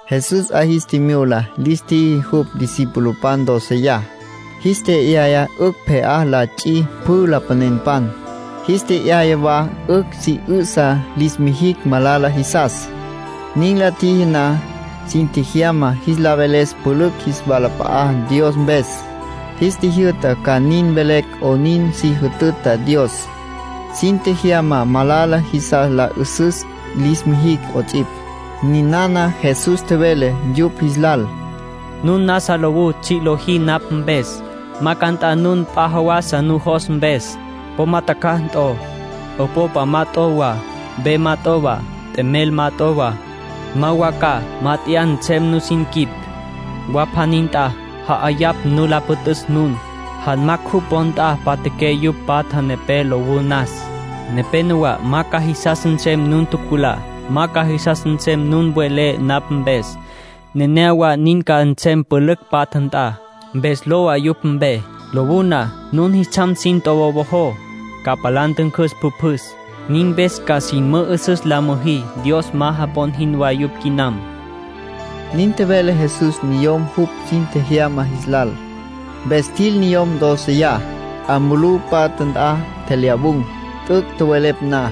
Jesús 'a jis tjimyula lis tjiji jupj discipulopan dóceya. Jis tje'yaya 'ücj pje'á la ts'i pjü lapanenpan. Jis tje'yaya wa 'ücj si 'ü'sa lis mijicj malala jisas. Nin la tjiji na, sin tjejyama jis la veles pülücj jis walap'a'á Dios mpes. Jis tjijyü'ta ca nin mvelecj 'onin si jütüta Dios. Sin tjejyama malala jisas la 'ü'süs lis mijicj 'ots'ipj. Ninana Jesús tjevele yupj jis lal: “Nun nasa lowú tsji' lojí napj mpes, ma ca nt'a nun p'a jawasa nujos mpes. Po ma tjacjaj t'o, 'opopa ma t'o wa, ve ma t'o wa, t'emel ma t'o wa. Ma wa ca mát'eya nsem nusin quip. Wa pjaní nt'a ja'ayapj nu la püt'üs nun, janmacj jupj wo nt'a mpatjaqué yupj patja nepé lowú nas. ”Nepénowa ma ca jisas nsem nun tjuculá. Ma ca jisas nsem nun welé napj mpes. Nenéyawa nin ca nsem pülücj patja nt'a. Mpes lowa yupj mpe. Lowú na, nun jis tsjam sin tjowowojó, ca palá ntüncüs pjüpjüs. Nin mpes ca sin mü'üsüs la müjí Dios ma japon jinwá yupj quinam”, nin tjevele Jesús niyom jupj sin tjejyama jis lal. Mpes tjil niyom dóceya. 'A mulú patja nt'a tjelyawun̈. T'üc' tjowelepj na,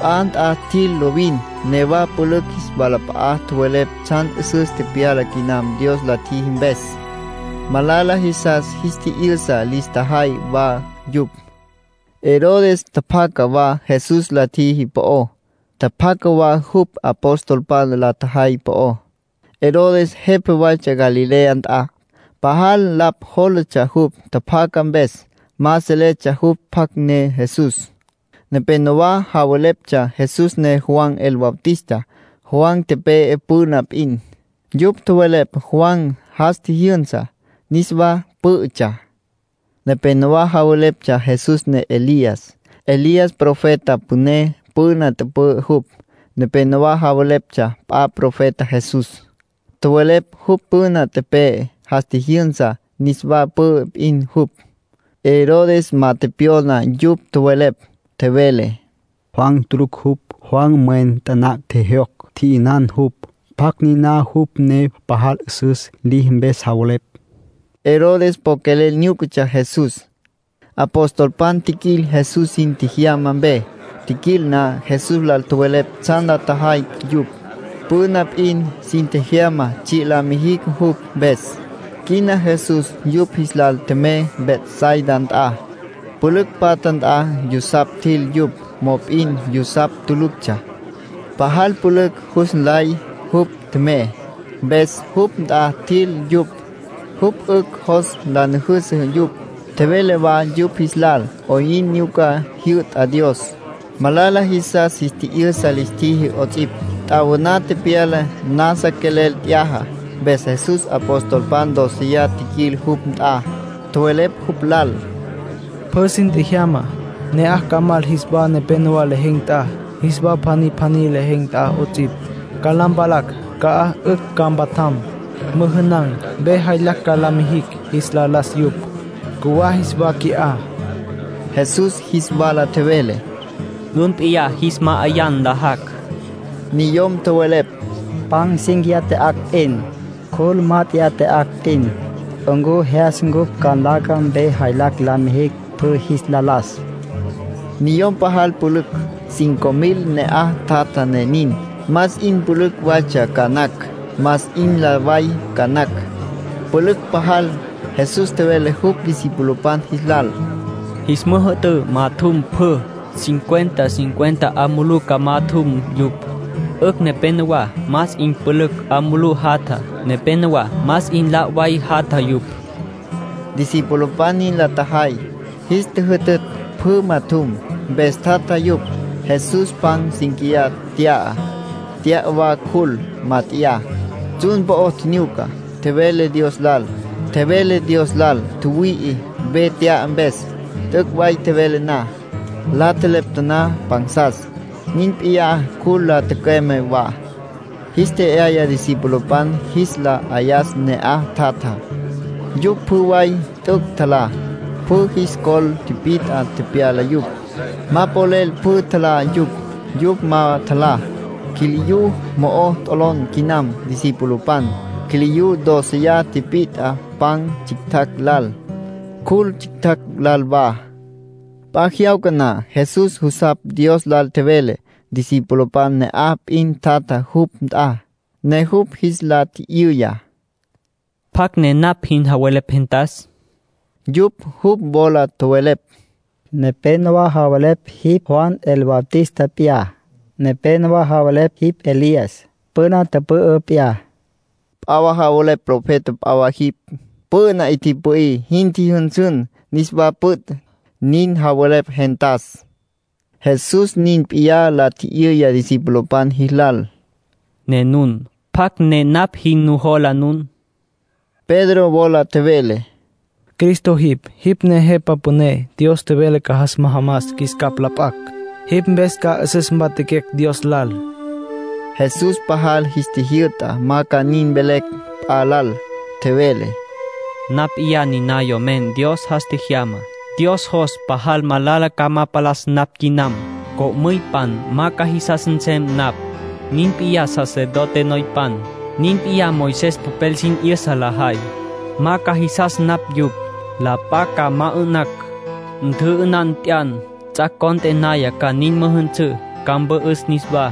p'a nt'a tjil lovin. Newa pülücj jis walap'a'a tjowelepj tsjan 'üsüs tepyala quinam Dios la tjiji mpes. Malala jisas jis tji'yü'sa lis tjajay wa yupj. Herodes tjapjaca wa Jesús la tjiji po'ó. Tjapjaca wa jupj apostolpan la tjajay po'ó. Herodes jepa waytsja Galilea nt'a. Pajal lapj jólatsja jupj tjapjaca mpes. Ma seletsja jupj pjacj ne Jesús. Nepénowa javeleptsja Jesús ne Juan el Bautista. Juan tepe'e püna p'in. Yupj tjowelepj Juan jas tjijyünsa, niswa pǘ'ütsja. Nepénowa javeleptsja Jesús ne Elías. Elías profeta püné püna tüpü'ü jupj. Nepénowa javeleptsja p'a profeta Jesús. Tjowelepj jupj püna tepe'e, jas tjijyünsa, niswa pü'ü p'in jupj. Herodes ma tepyona yupj tjowelepj. Tjevele: “Juan tulucj jupj. Juan mwen taná tjejyocj, tji'yünan jupj. ¿Pjacj niná? Jupj ne pajal 'üsüs liji mpes javelepj.” Herodes po quelel nyúcatsja Jesús. Apostolpan tjiquil Jesús sin tjejyama mpe. Tjiquil na, Jesús lal tjowelepj tsjan la tjajay yupj. Püna p'in sin tjejyama tsji' la mijicj jupj mpes. Quina Jesús yupj jis lal tjemey Betsaida nt'a, pülücj patja nt'a. Yusapj tjil yupj. Mop'in yusapj tuluctsja. Pajal pülücj jus nlay jupj tjemey, mpes jupj nt'a tjil yupj. Jupj 'ücj jos la nüjüsü yupj. Tjevele wa yupj jis lal 'oyn nyuca jyü'ta Dios. Malala jisas jis tji'yü'sa lis tjiji 'ots'ipj. T'awaná tepyala, nasa quelel t'yaja. Mpes Jesús apostolpan dóceya tjiquil jupj nt'a, tjowelepj jupj lal: —Pjü sin tjejyama, ne'aj ca mal jis wa nepénowa lejen̈ nt'a, jis wa pjaní pjaní lejen̈ nt'a 'ots'ipj. Ca la mpalacj ca'aj 'ücj ca mpatjam, müjünan̈. Ve jaylacj ca la mijicj jis la las yupj. Cjuwá jis wa qui'á. Jesús jis wala tjevele: —Nun p'iyá jis ma'ayá nlajacj. Niyom tjowelepj: —Pan cínquiya tya'acj p'in, cjul mát'eya tya'acj p'in. ¿Ncu jyas cupj ca nlaca ve jaylacj la mijicj pjü jis la las? Niyom pajal pülücj, sey cinco mil ne'aj tjatja ne nin. Más 'in pülücj waytsja ca nacj, más 'in la' way ca nacj. Pülücj pajal. Jesús tjevele jupj discipulopan jis lal: —Jis müjü'tǘ majatjum pjü. Cincuenta cincuenta 'a mulú ca majatjum yupj. 'Ücj nepénowa más 'in pülücj 'a mulú jatja, nepénowa más 'in la' way jatja yupj —tjevele Jesús. Discipulopan nin la tjajay. Jis tjüjütütj pjü majatjum, mpes tjatja yupj. Jesús pan cínquiya nt'ya, nt'ya wa cjul mat'eyá. Tsjun po'o tjinyuca, tjevele Dios lal tjüwüi'i ve tje'yaya mpes. T'üc' tjevele na, la tjelepta taná pansas. Nin p'iyá cjul la tücüeme wa. Jis tje'yaya discipulopan jis la 'ayas ne'aj tjatjá. Yupj pjü way t'üc' tjalá. Pjü jis col pit'a tepyala yupj. Ma polel pjü tjalá yupj. Yupj ma tjalá, quiliyú mo'o t'olon quinam discipulopan. Quiliyú dóceya tipit'a pan tsjictjacj lal, cjul tsjictjacj lal wa. P'a jyawca na, Jesús jusapj Dios lal tjevele. Discipulopan ne'aj p'in tjatja jupj nt'a, ne jupj jis la tji'yüya: —¿Pjacj ne napj jin javelepj gentas? Yupj jupj wola tjowelepj: —Nepénowa javelepj jipj Juan el Bautista p'iyá. Nepénowa javelepj jipj Elías, püna tüpü'ü p'iyá. P'a wa javelepj profeta p'a wa jipj. Püna 'i tipü'í, jin tjijyünsün, niswa püt', nin javelepj gentas. Jesús nin p'iyá la tji'yüya discipulopan jilal: —Ne nun ¿pjacj ne napj jin nujola nun? Pedro wola tjevele: —Cristo jipj. Jipj ne Jepa Püné Dios tjevele ca jas majamas qjuis capj la p'acj. Jipj mpes ca 'üsüs mpatjaquecj Dios lal. Jesús pajal jis tjijyü'ta ma ca nin mvelecj p'a lal. Tjevele: —Napj p'iyá niná Yomen Dios jas tjejyamá. Dios jos pajal malala ca ma palas napj quinam. Co'müypan ma ca jisas nsem napj. Nin p'iyá sacerdote noypan. Nin p'iyá Moisés popel sin 'yüsa lajay. Ma ca jisas napj yupj. La p'a ca ma 'ü'nacj. Ntjü'ünan tyan, ts'ac' cont'e naya ca nin müjünsǘ. Ca mpü'üs niswá.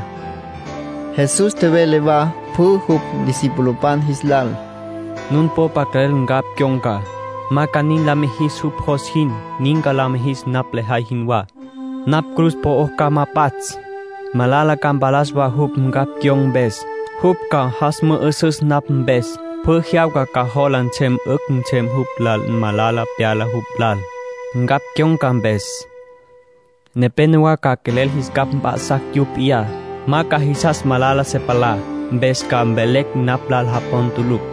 Jesús tjevele wa pjü jupj discipulopan jis lal: —Nun popa quelel ncapj cyon̈ca, ma ca nin la mijis jupj jos jinwá. Nin ca la mijis napj lejay jinwá. Napj cruz po'ó ca ma pats'. Malala ca mpalas wa jupj, ncapj cyon̈ca mpes. Jupj ca jas mü'üsüs napj mpes. Pjü jyawca ca jola nsem 'ücj nsem jupj lal malala pyala jupj lal, ncapj cyon̈ca mpes. Nepénowa ca quelel jis capj mp'a'sacj yupj p'iyá. Ma ca jisas malala se palá, mpes ca mvelecj napj lal japon tulucj.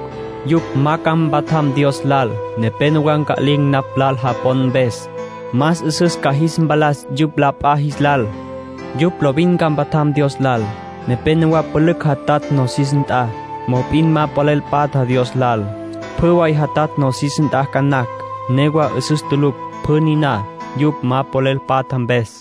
Yupj ma ca mpatjam Dios lal. Nepénowa nca'lin̈ napj lal japon mpes. Más 'üsüs ca jis mpalas yupj la p'a jis lal. Yupj lovin ca mpatjam Dios lal. Nepénowa pülücj jatatj nosis nt'a, mop'in ma polel patja Dios lal. Pjü way jatatj nosis nt'a ca nacj. Newa 'üsüs tulucj pjü niná, yupj ma polel patja mpes.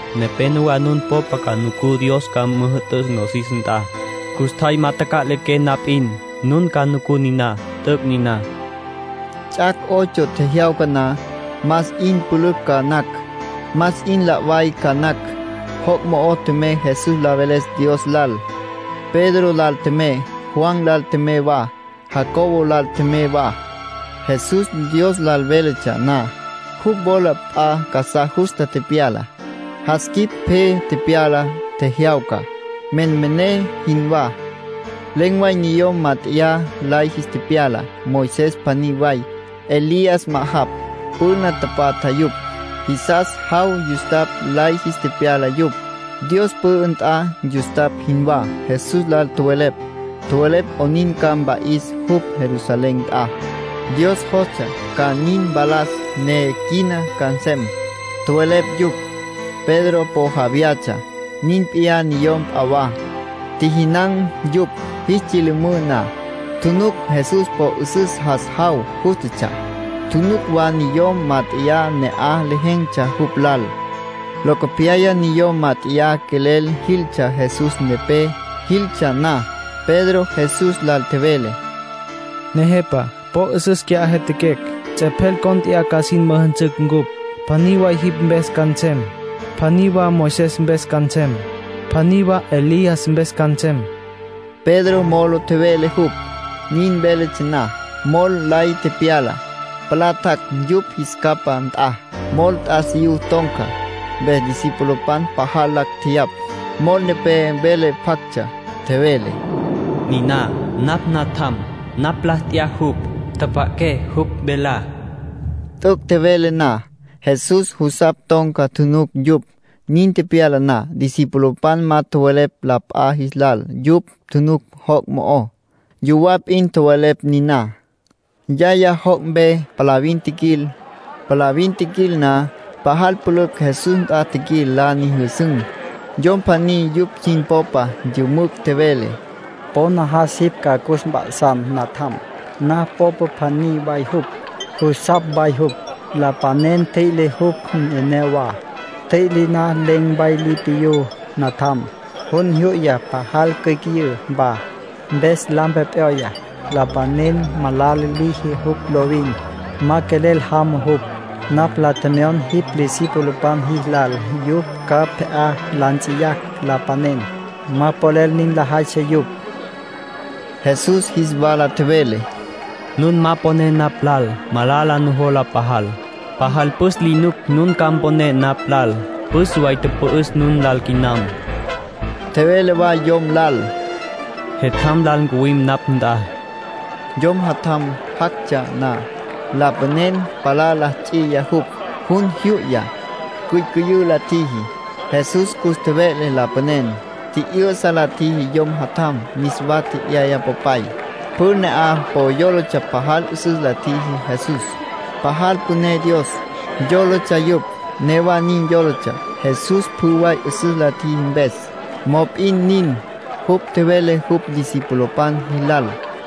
Nepénowa nun popa ca nucú Dios ca müjü'tüs nosis nt'a. Custjay ma taca'liqué na p'in, nun ca nucú niná. T'üc' niná —tjevele Jesús. Ts'ac' ocho tjejyawca na, más 'in pülücj ca nacj, más 'in la' way ca nacj, joc' mo'o tjemey Jesús la veles Dios lal. Pedro lal tjemey, Juan lal tjemey wa, Jacobo lal tjemey wa. Jesús Dios lal véletsja na, jupj wola p'a casá justa tepyala. Jas quip pje tepyala, tjejyawca, menmené jinwá. Len̈ way niyom mát'eya lay jis tepyala, Moisés pjaní way, Elías ma'ajapj, püna tapatja yupj. Jisas jaw yustapj lay jis tepyala yupj, Dios pü'ü nt'a yustapj jinwá. Jesús lal tjowelepj. Tjowelepj 'onin ca mpa'is jupj Jerusalén nt'a. Dios jostsja ca nin mpalas ne quina ca nsem, tjowelepj yupj. Pedro po ja vyatsja. Nin p'iyá niyom p'a wa. Tjijinan̈ yupj. Jis tsyülümǘ na, tjunuc Jesús po 'üsüs jas jaw jústatsja. Tjunuc wa niyom mát'eya ne'aj lejen̈tsja jupj lal. Locopyaya niyom mát'eya quelel jiltsja Jesús nepé. Jiltsja na, Pedro Jesús lal tjevele: —Nejepa, po 'üsüs qui'á jyatjaquecj. Ts'epjel cónt'eya ca sin müjünsüm cupj. Pjaní way jipj mpes ca nsem, pjaní wa Moisés mpes ca nsem, pjaní wa Elías mpes ca nsem. Pedro molo tjevele jupj. Nin véletsja na, mol lay tepyala, palá tjac' yupj jis capá nt'a. Mol t'asiyú ton̈ca, mpes discipulopan pajal lacj tjeyapj. Mol nepé vele pjactsja. Tjevele: “Niná napj Natjam. Napj la t'ya jupj. Tjapja'aqué jupj velá.” T'üc' tjevele na, Jesús jusapj ton̈ca tjunuc yupj. Nin tepyala na, discipulopan ma tjowelepj la p'a jis lal yupj tjunuc joc' mo'ó. Yuwá p'in tjowelepj niná. Yaya joc' mpe palavin tjiquil. Palavin tjiquil na, pajal pülücj Jesús nt'a tjiquil la nyüjüsün̈. Yom pjaní yupj sin popa yümücj tjevele: —Po najas jipj ca cus mp'a'san natjam. Napj mpopa pjaní way jupj. Jusapj way jupj. Lapanen tjüi'le jupj neneyawá. Ntjüi'le na, len̈ way li piyú natjam. Jun jyu'ya, pajal cyücüyǘ wa, mpes lampe p'yoya. Lapanen malala liji jupj lovin. Ma quelel jama jupj. Napj la tjemyon jipj discipulopan jis lal yupj ca pje'á la nts'iyacj lapanen. Ma polel nin lajaytsja yupj. Jesús jis wala tjevele: —Nun ma poné napj lal. Malala nujola pajal. Pajal püs li nuc nun ca mponé napj lal. Püs way tüpü'üs nun lal quinam. Tjevele wa yom lal: —Jetjam lal ncuwim napj nt'a. Yom jatjam jactsja na, lapanen palá la ts'iya jupj. Jun jyu'ya, cyücüyǘ la tjiji. Jesús cus tjeve'le lapanen. Tji'yü'sa la tjiji yom jatjam, niswa tje'yaya popay. Pjü ne'aj po yólatsja pajal 'üsüs la tjiji Jesús. Pajal püné Dios, yólatsja yupj. Newa nin yólatsja, Jesús pjü way 'üsüs la tjiji mpes. Mop'in nin, jupj tjevele jupj discipulopan jilal: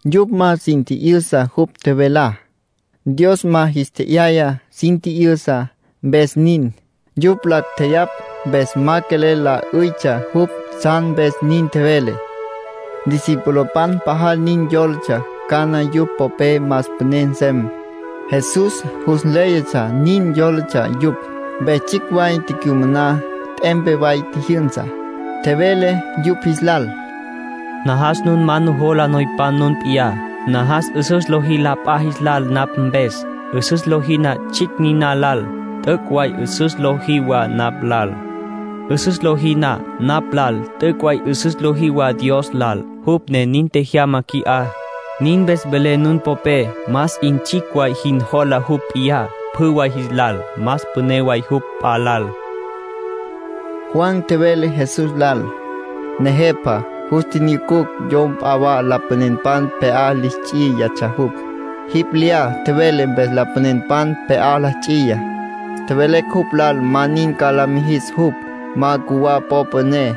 Yupj ma sin tji'yüsa jupj tjevelá. Dios ma jis tje'yaya sin tji'yüsa, mpes nin. Yupj lacj tjeyapj mpes ma quelel la 'üytsja jupj tsjan mpes nin tjevele. Discipulopan pajal nin yólatsja cana yupj popé más püné nsem. Jesús jus nléyatsja nin yólatsja yupj, mpes tsjicj way tecyumaná, t'empe way tjijyünsa. Tjevele yupj jis lal: —Najas nun ma nujola noypan nun p'iyá. Najas 'üsüs lojí la p'a jis lal napj mpes. 'Üsüs lojí na tsjicj niná lal, t'üc' way 'üsüs lojí wa napj lal. 'Üsüs lojí na napj lal, t'üc' way 'üsüs lojí wa Dios lal, jupj ne nin tjejyama qui'á. Nin mpes velé nun popé más 'in tsjicj way jin jola jupj p'iyá pjü way jis lal, más püné way jupj p'a lal —nin tjevele Jesús. Juan tjevele Jesús lal: —Nejepa, jus tjinyucucj yom p'a wa lapanenpan pje'á li ts'iyatsja jupj. Jipj lyá tjevele mpes lapanenpan pje'á la ts'iya. Tjevelecj jupj lal ma nin ca la mijis jupj, ma ncuwa popa ne.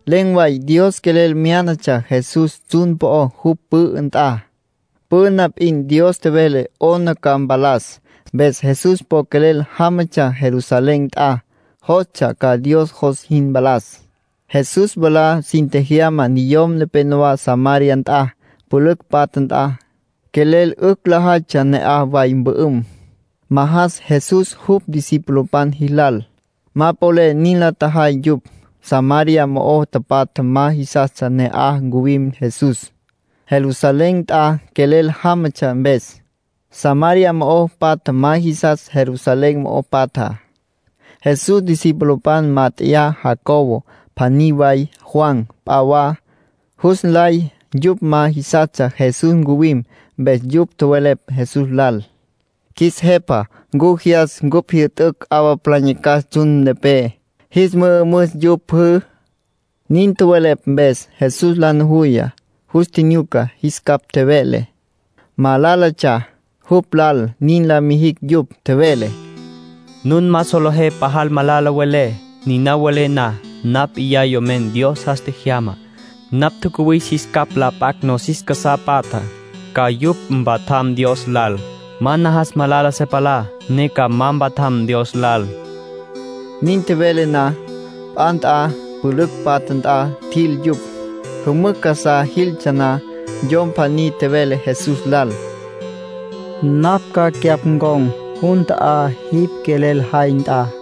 Len̈ way Dios quelel myánatsja Jesús tsjun po'ó jupj pü'ü nt'a. Püna p'in Dios tjevele 'ona ca mpalas. Mpes Jesús po quelel jámatsja Jerusalén nt'a. Jostsja ca Dios jos jin mpalas. Jesús mwalá sin tjejyama niyom nepenowá Samaria nt'a, pülücj patja nt'a. Quelel 'ücj lajaytsja ne'aj way mpü'üm, majas Jesús jupj discipulopan jis lal. Ma polel nin la tjajay yupj. Samaria mo'o tapatja ma jisastsja ne'aj ncuwim Jesús, Jerusalén nt'a quelel jámatsja mpes. (Samaria mo'o patja ma jisas Jerusalén mo'o patjá.) Jesús discipulopan mat'eyá, Jacobo pjaní way, Juan p'a wa, jus nlay yupj ma jisastsja Jesús ncuwim, mpes yupj tjowelepj Jesús lal: —Qjuis Jepa ¿ncu jyas ncupj jyü'tücj 'awa palá nyacas tsjun nepé, jis mü'ümüs yupj pjü? Nin tjowelepj mpes Jesús la nujuya, yus tjinyuca, jis capj tjeve'le. Malálatsja jupj lal nin la mijicj yupj. Tjevele: —Nun ma solejé pajal malala welé, niná welé na. Napj niná Yomen Dios jas tjejyamá. Napj tjacuwis jis capj la p'acj nosis casá patjá, ca yupj mpatjam Dios lal. Ma najas malala se palá ne ca ma mpatjam Dios lal —nin tjevele Jesús. Nin tjevele na, p'a nt'a pülücj patja nt'a tjil yupj. Jümücj casá jiltsja na, yom pjaní tjevele Jesús lal: —Napj ca cyapj ncon̈ jun ta'á jipj quelel jay nt'a.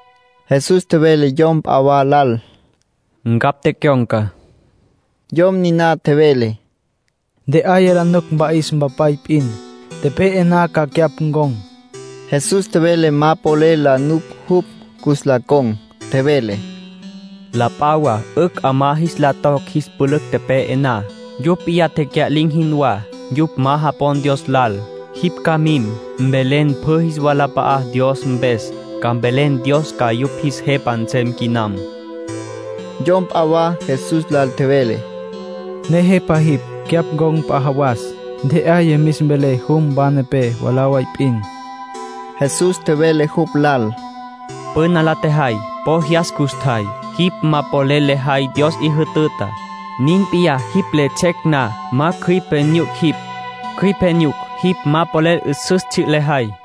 Jesús tjevele yom p'a wa lal: —Ncapj tecyon̈ca. Yom niná tjevele: —Ntje'aya la nuc mpa'is mpapay p'in. Tepe'e na ca cyapj ncon̈. Jesús tjevele ma polel la nuc jupj cus la con̈. Tjevele: —La p'a wa 'ücj 'amá jis la toc jis pülücj tepe'e na. Yupj p'iyá tecya'lin̈ jinwá, yupj ma japon Dios lal. Jipj ca mim, mvelen pjü jis walap'a'á Dios mpes. Ca mvelen Dios ca yupj jis Jepa nsem quinam. Yom p'a wa Jesús lal tjevele: —Nejepa jipj. Cyapj ncon̈ p'a jawas. Ntje'aya mis mvelé jum wa nepé mwalá way p'in. Jesús tjevele jupj lal: —Püna la tjejay po jyas custjay, jipj ma polel lejay Dios 'i jütütá. Nin p'iyá jipj le ts'ec na ma cjüipe nyuc jipj. Cjüipe nyuc, jipj ma polel 'üsüs tsji' lejay.